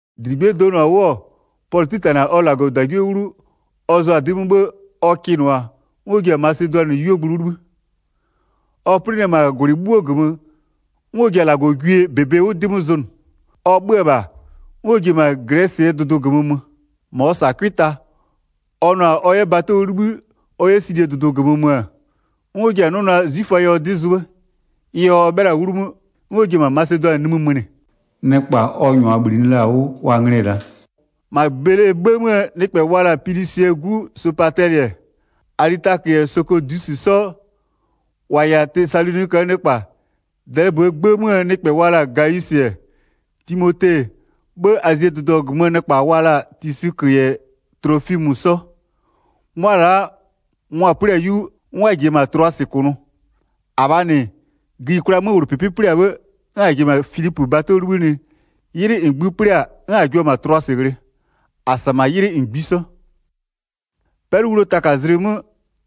1-Dligbie donʋ-a 'wʋ-ɔ, Pɔlʋ 'titanɩ-a -Lagɔgwie 'wlu, ɔ zʋa-a 'dɩ 'mö 'bhë ɔ kɩnʋa-a, 'n ɔ ji-a Masedʋanɩɛ 'yuogblʋ 'wʋ 'libhï. Ɔ 'plɩnɩ-ɛ -maa -gwlɩ 'bhuoo -gömö, 'n ɔ ji-a -Lagɔgwie -bebe 'wʋ 'dɩ 'mö zʋnʋ. Ɔ 'bhö-ö -bha, 'n ɔ ji-e -ma Glɛsɩɛ dʋdʋ -gömö mö. 3-Ma ɔ -sa-a 'cʋɩ ta. Ɔ nʋ-a ɔ 'yɛ bato 'wʋ 'libhï ɔ 'yɛ Silie dʋdʋ -gömö mö-ö, 'n ɔ ji-a 'nʋ naa 'zwiföa yɛ ɔ 'dɩ zʋ 'bhë. Ɩ yɛ ɔ 'bhɩla-a 'wlu 'mö, 'n ɔ ji-e -ma Masedʋanɩ nimï mönɩ. Nɩkpa ɔ -nyʋa -bhlinɩ la-a 'wʋ wa nglɩ-ɛ la'a: -Ma Belee 'gbë 'möö nɩkpɛ wa la-a Pilusɩɛ 'gu Sopatɛlɩ-ɛ, Alitakö -yɛ Sokɔdusɩ 'sɔ, -wa -yɛ-a Tesaloniköö nɩkpa, Dɛlɩböö 'gbë 'möö nɩkpɛ wa la-a Gawisɩ-ɛ, Timote-e, 'bhë Azie dʋdʋ -gömöö nɩkpa wa la-a Tisikö -yɛ Tlofimö 'sɔ. 'Mʋa -wa la'a, mʋa-a 'plɩ-a 'yu, 'n wa -jiya-a -ma Tlʋasɩ -kʋnʋ. 6-Abhaa -nɩ, gïyikwlaa 'möwlʋpɩpɩ 'plɩ-a 'bhë, 'n -a ji-e -ma Filipö bato 'wʋ 'libhïnɩ, 'ylɩ -ngbï 'plɩ-a 'n -a jua-a -ma Tlʋasɩ ghlɩ. -A -sa -ma 'ylɩ -ngbisɔ. 'Pɛlʋwluo taka zlɩ 'mö,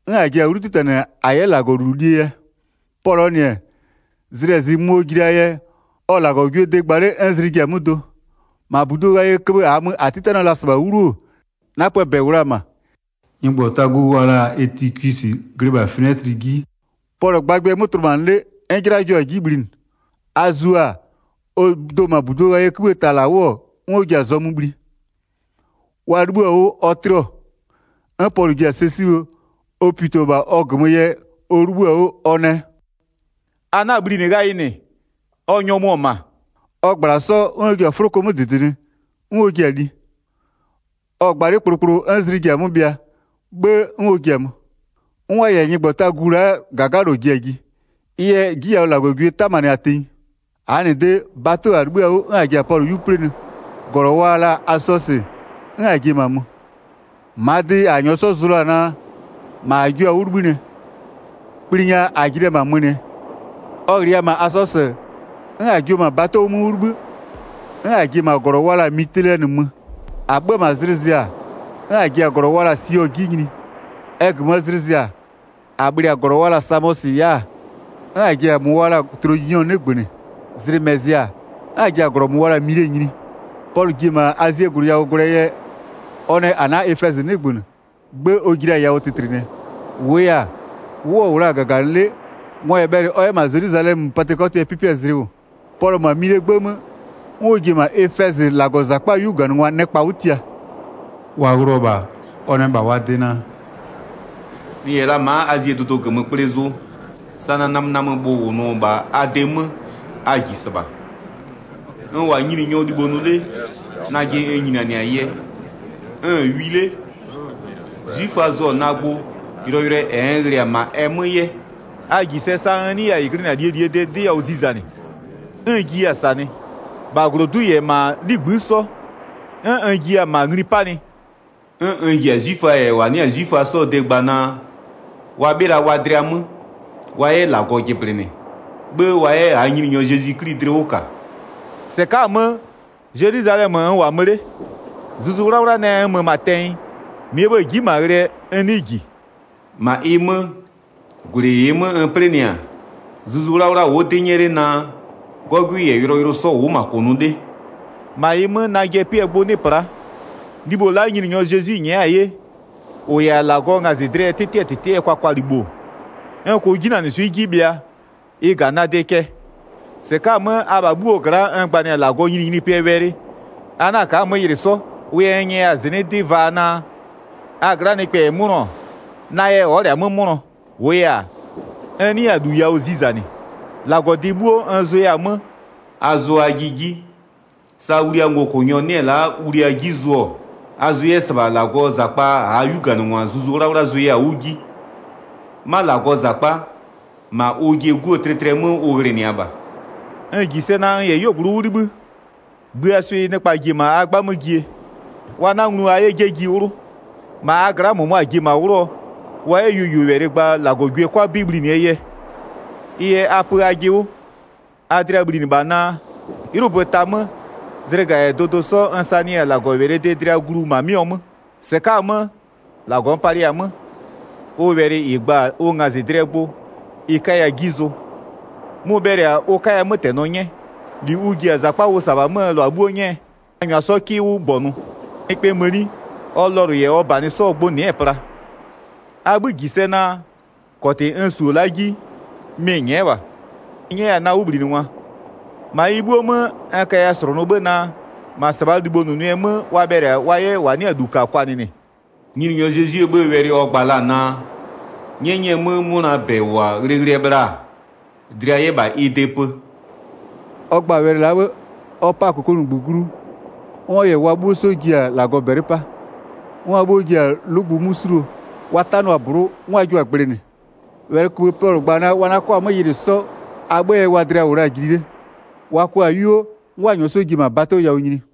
'n -a ji-a 'wlu 'titanɩ -a 'yɛ -Lagɔlulu lie yɛ. Pɔlʋɔ -nɩ-ɛ, zlɩ -yɛ zɩ mö ɔ ji la-aa yɛ, ɔ-ɔ -Lagɔgwiee de gba 'le 'n zlɩ ji-a 'mö do. 8-Ma -budu ghayɩɛ köbhë -aa mö -a 'titanɩɔ la-a -sɩbha 'wlu-o, 'napöö -bɛ -wʋ la-a -ma. Nyɩgbɔtagu wa la-a Etikwisɩ glɩ -bha finɛtlɩ 'ji, Pɔlʋ-ɔ gbagbɩɛ 'mö tlʋmanɩ 'le, 'n 'jɩla jio-a 'ji bhlinɩ. A zio-a, ɔ do-o -ma -budu ghayɩɛ 'kïbhïë ta -la 'wʋ-ɔ, 'n ɔ ji-a zɔmö bhli. Wa 'libhïɔ-a 'wʋ ɔ 'tlɩɔ. 'N Pɔlʋ ji-a sɛ 'sibhë, ɔ pito-o -bha ɔ -gömö yɛ ɔ 'libhïɔ-a 'wʋ, ɔ nɛ: “A 'na-a bhlinɩ ghayɩ -nɩ, ɔ nyɔmʋ-ɔ -ma.” Ɔ -gbla-a 'sɔ, 'n ɔ ji-a 'fʋloko 'mö -dɩdɩnɩ 'n ɔ jia-a li. Ɔ-ɔ gba 'le kplokplo 'n zlɩ ji-a 'mö bhɩa, 'bhë 'n ɔ ji-a mö. 'N wa -yɛ nyɩgbɔtagu la'aa -gagalɔ ji-a ji. Ɩ yɛ 'ji yawʋ -Lagɔgwie 'tamanɩ-a tenyi. -Glɔ wa la-a Mile, Pɔlʋngwa yɛ -ma mö 13-Aa -nɩ de, bato -a 'libhï-a 'wʋ 'n -a ji-a Pɔlʋ 'yu 'plɩnɩ, -glɔ wa la-a Asɔsɩ, 'n -a ji-e -ma mö. -Maa dɩ a -nyɔɔ 'sɔ zʋ la-a naa, -ma -a jio-a 'wʋ 'libhïnɩɛ. Kpli nya ɔ ji la-a -ma mönɩɛ. Ɔ -ghlɩya-a -ma Asɔsɩ-ɛ, 'n -a jio-o -ma bato 'mö 'wʋ 'libhï, 'n -a ji-e -ma -glɔ wa la-a Mitilɛnɩ mö. 15-A 'bhö-ö -bha zlɩ zɩ-a, 'n -a ji-a -glɔ wa la-a Sio 'ji nyini. Ɛ -gömöö zlɩ zɩ-a, -a bhlɩ-a -glɔ wa la-a Samɔsɩ ya'a, 'n -a ji-a -mʋ wa la-a Tloginyɔ 'nɩgbönɩ. Zlɩ -mɛ zɩ-a, 'n -a ji-a -glɔ wa la-a Mile nyini. Pɔlʋ ji-e -ma Azie -gwlɩ yawʋ gwlɛɛ yɛ, ɔ nɛ ɔ 'na Efɛzɩ 'nɩgbönɩ, 'gbë ɔ ji la-a yawʋ tɩtlɩnɩɛ. -Wʋʋ yɛ-a, 'wʋ ɔ -wʋ la-a -gaganɩ 'le, mɔ -yɛ bhɛlɩ ɔ 'yɛ -ma Zelwizalɛmö Patɩkɔtɩɛ 'pɩpɩɛ zlɩ -wʋ. Pɔlʋ-ɔ -ma Milee 'gbë 'mö, 'n ɔ ji-e -ma Efɛzɩ -Lagɔzakpaa 'yuganɩngwa nɩkpa 'wʋ tia. Wa ghlɩɔ-ɔ -bha, ɔ nɛ -bha wa de naa: “N -yɛ la ma'a Azie dʋdʋ -gömö kple zʋ, sa na namönamöbhʋ -wʋnʋ-ɔ -bha a de 'mö a -ji -sɩbha. N -wʋ-a Nyininyɔɔ libho nʋ 'le, najɩ n nyinianɩ-a yɛ, n-n wi 'le, 'zwiföa zʋ-ɔ na gbʋ yʋlɔyʋlʋɛ -ɛ n ghlɩ-a -ma ɛ mö 'yɛ. A -ji sɛ sa n 'nɩya-a -ɩ glɩnɩ-a a -lie -lie 'dɩ yawʋ zizanɩ, 'n n jiya-a -sanɩ, -bha -glodu'u -yɛ -ma a 'ligbï'ï 'sɔ, 'n n jiya-a -ma ngli 'panɩ. 'N n ji-a 'zwiföa -yɛ -wa 'nɩ-a 'zwiföa 'sɔɔ de gba naa, wa 'bhɩla wa dlɩa 'mö, wa 'yɛ -Lagɔ jɩblɩnɩ, 'bhë wa 'yɛ -aa Nyininyɔ Zezwi 'Kli dlɩ 'wʋ -ka. 22-Sɩka'a-a 'mö, Zelwizalɛmö n -wʋ-a mö 'le, Zuzu 'Wlawla nɛ n mö -ma tɛnyɩ, -mɩɛ 'bhë-ë ji'i -ma ghlɩɛ n 'nɩɩ -ji. 23-Ma ɩ 'mö, -gwlɩ -ɩɩ 'mö n 'plɩnɩ-a, Zuzu 'Wlawla wʋ'ʋ 'dɩ 'nyɛ 'le naa 'gɔgwɩ -yɛ yʋlɔyʋlʋ 'sɔ -wʋ'ʋ -ma -kʋnʋ 'le. 24-Ma ɩ 'mö, najɩɛ 'pɩɛ gbʋ 'nɩ pla'a. Libho la'a Nyininyɔ Zezwi nyɛ'ɛ-a 'ye -ʋ -yɛ-a -Lagɔɔ ngazɩdlɩɛ 'tɩtɩɛ -tɩtɩɛ kwakwalibho-o, n -kʋʋ 'jinanɩswɩ'ɩ 'ji bhɩa, ɩ -ga na de cɛ. 25-Sɩka'a-a 'mö, abha 'bhuoo gla'a n gbanɩ-a -Lagɔɔ nyininyinipɩɛ wɛlɩ, a 'na-a ka'a-a 'mö yɩlɩ 'sɔ. 26Wʋ yɛ n nyɛya-a -zɩnɩ'ɩ 'dɩ vaa naa, a gla'aa nɩkpɛ -yɛ 'mʋnɔ-ɔ, na yɛ ɔ'ɔ -lɛ-a 'mö 'mʋnɔ. 27-Wʋʋ yɛ-a, n 'nɩya-a -lu yawʋ zizanɩ, -Lagɔdɩ 'bhuo n zʋya-a 'mö. 28A zʋ ajɩ 'ji, sa wliaa ngokʋnyɔ 'nɩ-ɛ la'a wlia 'ji zʋ-ɔ, a zʋ 'yɛ -sɩbha -Lagɔɔ -zakpa -aa 'yuganɩngwa Zuzu 'Wlawla zʋaya-a 'wʋ 'ji. 'Ma -Lagɔɔ -zakpa, -ma ʋjɩɛ 'Guo tlɩtlɩɛ 'mö ʋ ghlɩnɩa -bha. 29N -ji sɛ naa n -yɛ 'yuogblʋ 'wʋ 'libhï, gbïaa swɩ nɩkpa ji-e -ma a 'gbamö jie, wa 'na nglu a 'yɛ 'jeji 'wlʋ. 30-Ma a gla'a -mʋmʋa ji-e -ma 'wlʋɔ wa 'yɛ yuoyuowɛlɩ gba -Lagɔgwie 'kʋa 'bɩ bhlinɩɛ yɛ. 31Ɩ yɛ a pö ajɩ 'wʋ, a dlɩa bhlinɩ -bha naa, 'ylʋbö ta 'mö, zlɩga -yɛ dʋdʋ 'sɔ n sanɩya-a -Lagɔwɛlɩɛ de dlɩa glu -ma 'mɩɔ 'mö. 32-Sɩka'a-a 'mö, -Lagɔ n palɩya-a 'mö, ʋ wɛlɩ -ɩ gba-a ʋ ngazɩdlɩɛ gbʋ ɩ 'kaya 'ji zʋ. Mʋ-ʋ bhɛlɩ-a ʋ 'kaya 'mötɛnɔ 'nyɛ, -li ʋ ji-a -zakpa ʋ -sa-a -bhaa 'möö -lʋa 'bhuo 'nyɛɛ, a -nyʋa 'sɔ 'kɩ 'wʋ -gbɔnʋ. 33Nɩkpɛɛ mëni, ɔ lɔlʋ -yɛ ɔ -banɩ 'sɔɔ gbʋ nɩ'ɩ-ɛ pla. 34A 'bhï -ji sɛ naa, -kɔtɩ n su-o la'a 'ji, mɩ-ɩ nyɛ'ɛ -bha, mɩ-ɩ 'nyɛ 'yɛ-a na 'wʋbhlinɩngwa. 35-Ma ɩ 'bhuo 'mö, n kaya -slʋnʋ 'bhë naa, -ma -sɩbhaa libhonʋnʋɛ 'mö wa bhɛlɩ-a wa 'yɛ -wa 'nɩ-a -lu -ka kwanɩnɩ. Nyininyɔ Zezwie 'bhëë wɛlɩ ɔ gba la-a naa, 'nyɛnyɩɛ 'mö 'mʋnaa -bɛ -wʋ-a ghlɩghlɩɛ bhla-a, dlɩa 'yɛ -bha ɩ de pö.” 36Ɔ gba-a wɛlɩ la'a 'bhë-ë, ɔ 'pa-a -kokomunigbö glu, 'n ɔ -yɛ wa 'bhuo 'sɔ ji-a -bɛlɩ 'pa. 37'N wa 'bhuo ji-a 'lʋgbʋ 'mö 'suluo, wa 'tanɩɔ-a -blʋ'ʋ 'n wa jio-a gblɩnɩ. 38Wɛlɩköbhë Pɔlʋ gba-a naa wa 'na 'kɔ-a 'mö yɩlɩ 'sɔ a 'bhëë yɛ wa dlɩa -wʋ la-a jili 'le. Wa kɔ-a 'yuo, 'n wa -nyɔɔ ji-e -ma bato yawʋ nyini.